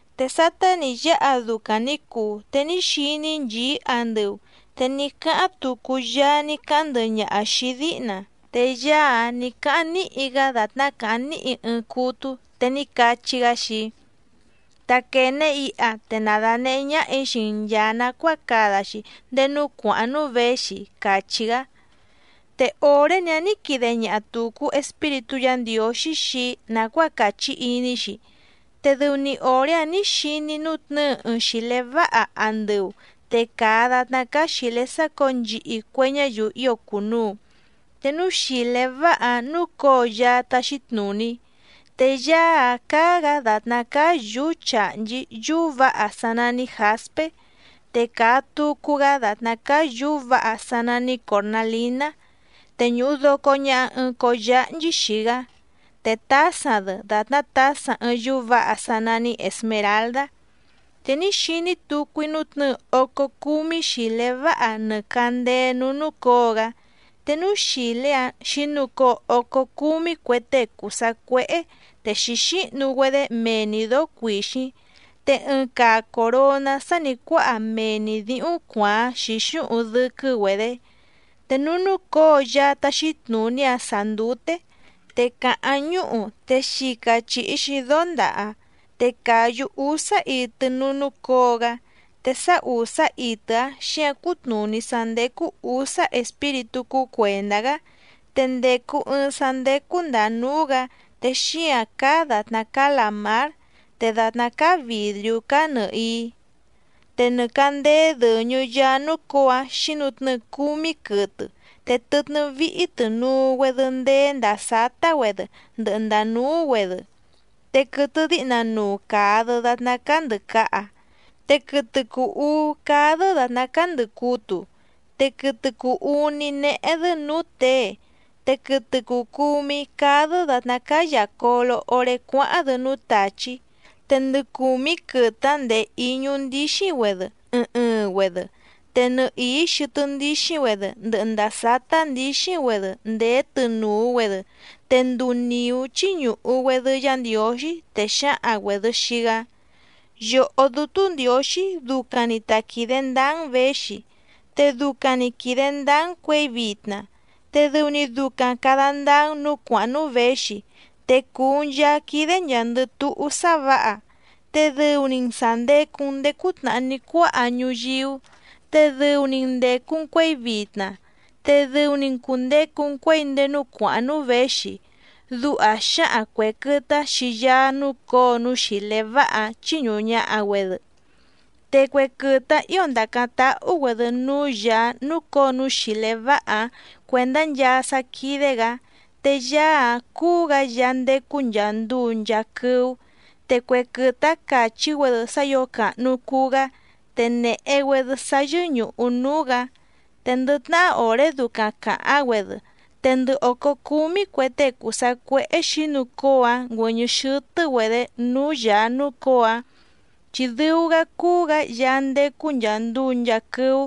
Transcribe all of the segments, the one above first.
Te sátá nǐ yáha ducaⁿ nǐ cuu te ní xiní‑í nchìí andɨu, te ní cáháⁿ tucu Yaá ní cáháⁿ ndɨhɨ ñaha xìi‑í díhna, te Yaá‑áⁿ nǐ cáháⁿ níhi‑gá dàtná càháⁿ níhi ɨɨⁿ cútú, te ní cachí‑gá xii‑í: —Taquène iha te na dànehé ñáhà‑í xii‑n nchàa nacuáa cada‑xi ndéé núú cuàháⁿ núú věxi —càchí‑gá. Te òré‑ni‑áⁿ nǐ quide ñaha tùcu Espíritú Yǎ Ndiǒxí xii‑í nàcuáa càchí iní‑xi, te dɨu‑ni òré‑áⁿ nǐ xiní‑í nútnɨ̌ɨ ɨɨⁿ xìlé váha andɨu te càa datná cáá xìlé sácǒo nchihi cue ñáyiu ío cùnuu, te núú xìlé váha‑áⁿ núcǒo Yaá táxí tnùní. Te Yaá‑áⁿ cáá‑gǎ dàtná cáá yǔú chàhnchí yúú vǎha sá nání jǎspé, te càa tucu‑gá dàtná cáá yǔú vǎha sá nání còrnalíná, te ñùhu doco ñaha ɨɨⁿ cóó yáhnchí xii‑gá, te tǎsaⁿ‑dɨ dàtná tǎsaⁿ ɨɨⁿ yúú vǎha sá nání èsmeraldá. Te ní xiní tucu‑í nútnɨ̌ɨ ócó cúmí xìlé váha nɨ càndéé núú núcǒo‑gá, te núú xìlé‑áⁿ xǐnucóo ócó cúmí cue tée cùu sacuéhé te xǐxíhnu‑güedé mee‑ni dǒó cuìxíⁿ, te ɨɨⁿ caa coròná sá nì cuáha mee‑ni dǐhúⁿ cuàáⁿ xǐxúhuⁿ dɨ́quɨ́‑güedě. Te núú núcǒo Yaá táxí tnùní‑áⁿ sàá ndúté, te càháⁿ ñúhu te xica chìhi‑xi dóndaha, te càyú úsá itɨ núú núcǒo‑gá, te sá ùsá itɨ‑áⁿ xǐǎⁿ cútnùní sá ndécú ǔsá espíritú cúú cuèndá‑gá. Te ndècu ɨɨⁿ sá ndécú ndàa núú‑gǎ te xíǎⁿ cáá dàtná cáá làmár, te dàtná cáá vìdriú cáá nɨ̀hií. Te nɨ càndéé dɨ̀ñɨ Yaá núcǒo‑áⁿ xǐnutnɨ́ɨ cúmí quɨtɨ te tɨtnɨ́ víhí tɨ̀nuu‑güedɨ ndeé ndàa sátá‑güedɨ ndɨhɨ ndàa núú‑güedɨ. Te quɨtɨ díhna nuu càa‑dɨ datná cáá ndɨ̀caha, te quɨtɨ cùu uú cáá‑dɨ́ dàtná cáá ndɨ̀cutu, te quɨtɨ cùu uní néhé‑dɨ́ nǔú těe, te quɨtɨ cùu cumí cáá‑dɨ́ dàtná cáá yàcolo oré cuáháⁿ‑dɨ núú tàchí. Te ndɨ cùmí quɨtɨ‑áⁿ ndèé íñú ndíxíⁿ‑güedɨ ɨɨⁿ ɨɨⁿ‑güedɨ, te nɨhìí xɨtɨ́ ndíxíⁿ‑güedɨ ndɨhɨ ndàa sátá ndǐxíⁿ‑güedɨ ndèé tɨnùu‑güedɨ, te nduu nìú chíñùhu‑güedɨ Yá Ndiǒxí, te xǎhaⁿ‑güèdɨ xii‑gá: Yòhó Dútú Ndiǒxí ducaⁿ‑ni ta quìde ndáá‑n věxi, te ducaⁿ‑ni quìde ndáá‑n cuěi vitna, te dɨu‑ni ducaⁿ càda ndáá‑n nǔú cuàháⁿ núú věxi, te cùu‑n Yaá quídé nchàa‑ndɨ túhú sá vǎha, te dɨu‑ni‑n sà ndecu‑n ndéé cútnàhá ní cuáha ñuyíú, te dɨu‑ni‑n ndècu‑n cuéi vitna, te dɨu‑ni‑n cùndecu‑n cuéi ndéé núú cuàháⁿ núú věxi. Duha xǎhaⁿ cuè quɨtɨ‑áⁿ xii Yaá núcǒo núú xìlé váha‑áⁿ chíñùhu ñaha‑güedɨ. Te cue quɨtɨ‑áⁿ ǐo ndàcáⁿ táhú‑güèdɨ núú Yàá núcǒo núú xìlé váha‑áⁿ cuèndá nchaa sá quídé‑gǎ. Te Yaá‑áⁿ cúú‑gǎ Yaá ndécú nchàa nduu nchaa quɨ́ú. Te cue quɨtɨ‑áⁿ càchí‑güedɨ sá ǐo càhnu cuu‑gá te nèhe‑güedɨ sá yɨ́ñùhu núú‑gǎ. Te ndɨ tnahá òré ducaⁿ càháⁿ‑güedɨ, te ndɨ òcó cúmí cue tée cùu sacuéhé xǐnucóo‑áⁿ ngüɨ̀ñɨ́ xɨ́tɨ́‑güedě núú Yàá núcǒo‑áⁿ, chi dɨu‑gá cúú‑gǎ Yaá ndécú nchàa nduu nchaa quɨ́ú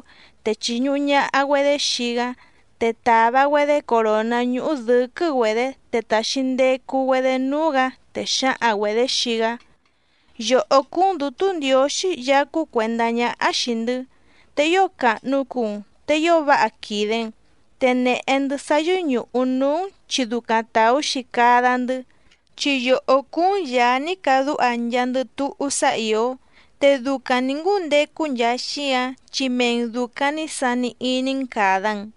te chìñuhu ñaha‑güedé xii‑gá, te tàva‑güedé coròná ñúhú dɨ̌quɨ́‑güedě te tàxi ndecu‑güedé núú‑gǎ, te xǎhaⁿ‑güedě xii‑gá: Yòhó cúú‑n Dǔtú Ndiǒxí Yaá cúú cuèndá ñáhá xìi‑ndɨ́, te ío càhnu cuu‑n, te ío váha quìde‑n, te nèhe‑ndɨ́ sá yɨ́ñùhu núú‑n, chi ducaⁿ tàú‑xi cada‑ndɨ́, chi yòhó cúú‑n Yàá ní cadúha nchaandɨ túhú sá ìó, te ducaⁿ nǐ ngúndecu nchaa xíǎⁿ chi mee‑n dùcaⁿ ní sani iní‑n càda‑n.